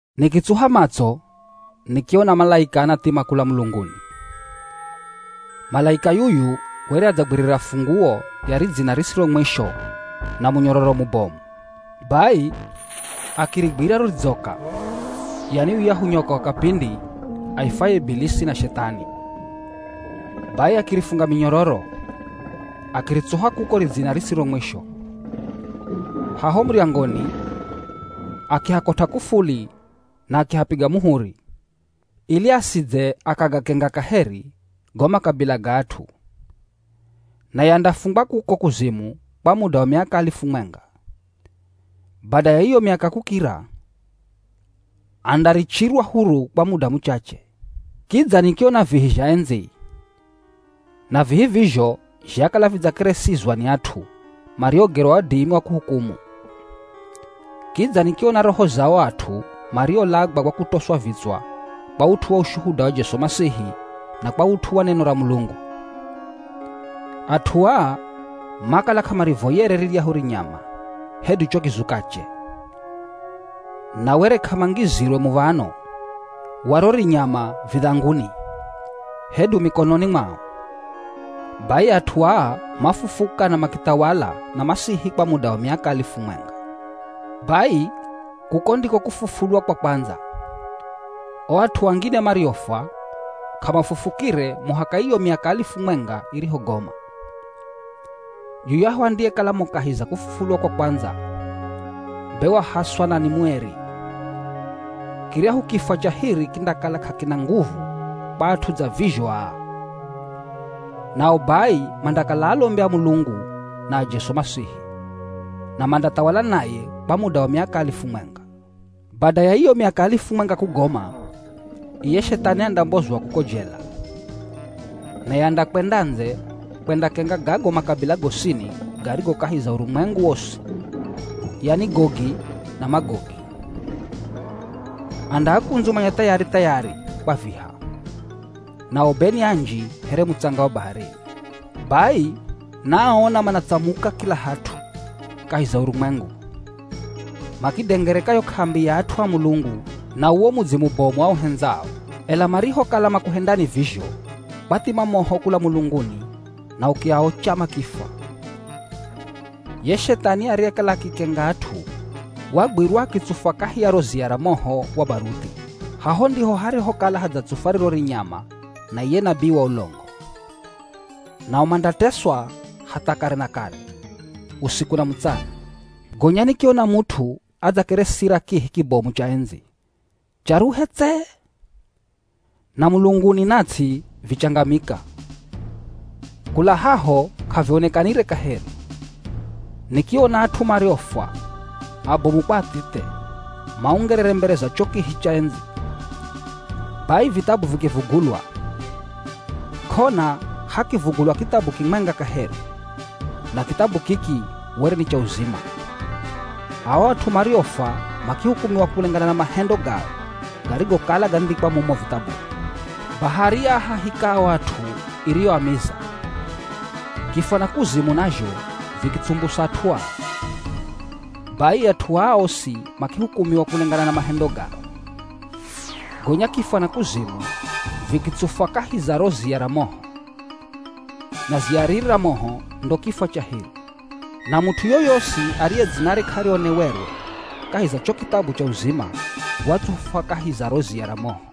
Nikitsuha matso nikiona malaika anathima kula mulunguni. Malaika yuyu were adzagwirira funguo ya ridzina risiro mwisho na munyororo mubomu. Bai akirigwira ro ridzoka, yani yuyahu nyoka wa kapindi, aifwaye Ibilisi na Shethani. Bai akirifunga minyororo, akiritsuha kuko ridzina risiro mwisho. Haho muryangoni akihakot'a k'ufuli na akihapiga muhuri, ili asidze akagakenga kaheri go makabila ga at'u. Naye andafungwa kuko kuzimu kwa muda wa miaka alifu mwenga. Bada ya iyo miaka kukira, andarichirwa huru kwa muda muchache. Kidza nikiona vihi zha endzi. Na vihi vizho zhakala vidzakeresizwa ni at'u mariogerwa wadimi wa kuhukumu. Kidza nikiona roho za ao at'u mariolagwa kwa kutoswa vitswa kwa ut'u wa ushuhuda wa Jesu Masihi na kwa ut'u wa neno ra Mulungu. At'u aa makala k'amarivoyere riryahu rinyama hedu cho kizukache. Na were k'amangizirwe muv̱ano wa ro rinyama vidhanguni, hedu mikononi mwao. Bai at'u aa mafufuka na makithawala na Masihi kwa muda wa miaka alifu mwenga. Bai kuko ndiko kufufulwa kwa kwandza. O at'u angine mariofwa, k'amafufukire muhaka iyo miaka alifu mwenga irihogoma. Yuyahu andiyekala mo kahi za kufufulwa kwa kwandza, be wahaswa na ni mueri. Kiryahu kifwa cha hiri kindakala k'akina nguvu kwa at'u dza vizho aa. Nao bai mandakala alombi a Mulungu na a Jesu Masihi, na mandathawala naye kwa muda wa miaka alifu mwenga. Bada ya iyo miaka alifu mwenga kugoma, iye Shethani andambozwa kuko jela. Naye andakwenda ndze kwendakenga gago makabila gosini garigo kahi za urumwengu wosi, yani Gogi na Magogi. Andaakundzumanya thayari-thayari kwa viha. Nao be ni anji here mutsanga wa baharini. Bai naaona manatsamuka kila hat'u kahi za urumwengu. Makiidengereka yo k'ambi ya at'u a Mulungu na uwo mudzi mubomu auhendzao, ela marihokala makuhendani vizho, kwathima moho kula mulunguni na ukiaocha makifwa. Ye Shethani ariyekala akikenga at'u, wagwirwa akitsufwa kahi ya ro ziya ra moho wa baruthi. Haho ndiho harihokala hadzatsufwa riro rinyama na iye nabii wa ulongo. Nao mandateswa hatha kare na kare, usiku na mutsana. Gonya nikiona mut'u adzakeresira kihi kibomu cha endzi, charuhe tse. Na mulunguni na ts'i vichangamika, kula haho k'avionekanire kaheri. Nikiona at'u mariofwa, abomu kwa athithe, maungerere mbere za cho kihi cha endzi. Bai vithabu vikivugulwa. K'ona hakivugulwa kithabu kimwenga kaheri, na kithabu kiki were ni cha uzima. Ao at'u mariofwa makihukumiwa kulengana na mahendo gao garigokala gandhikwa mumo vithabuni. Bahari yaahahika ao at'u iriyoamiza. Kifwa na kuzimu nazho vikitsumbusa at'u ao. Bai at'u aa osi makihukumiwa kulengana na mahendo gao. Gonya kifwa na kuzimu vikitsufwa kahi za ro ziya ra moho. Na ziya riri ra moho ndo kifwa cha hiri. Na mut'u yoyosi ariye dzinare k'arionewerwe kahi za kicho kithabu cha uzima watsufwa kahi za riro ziya ra moho.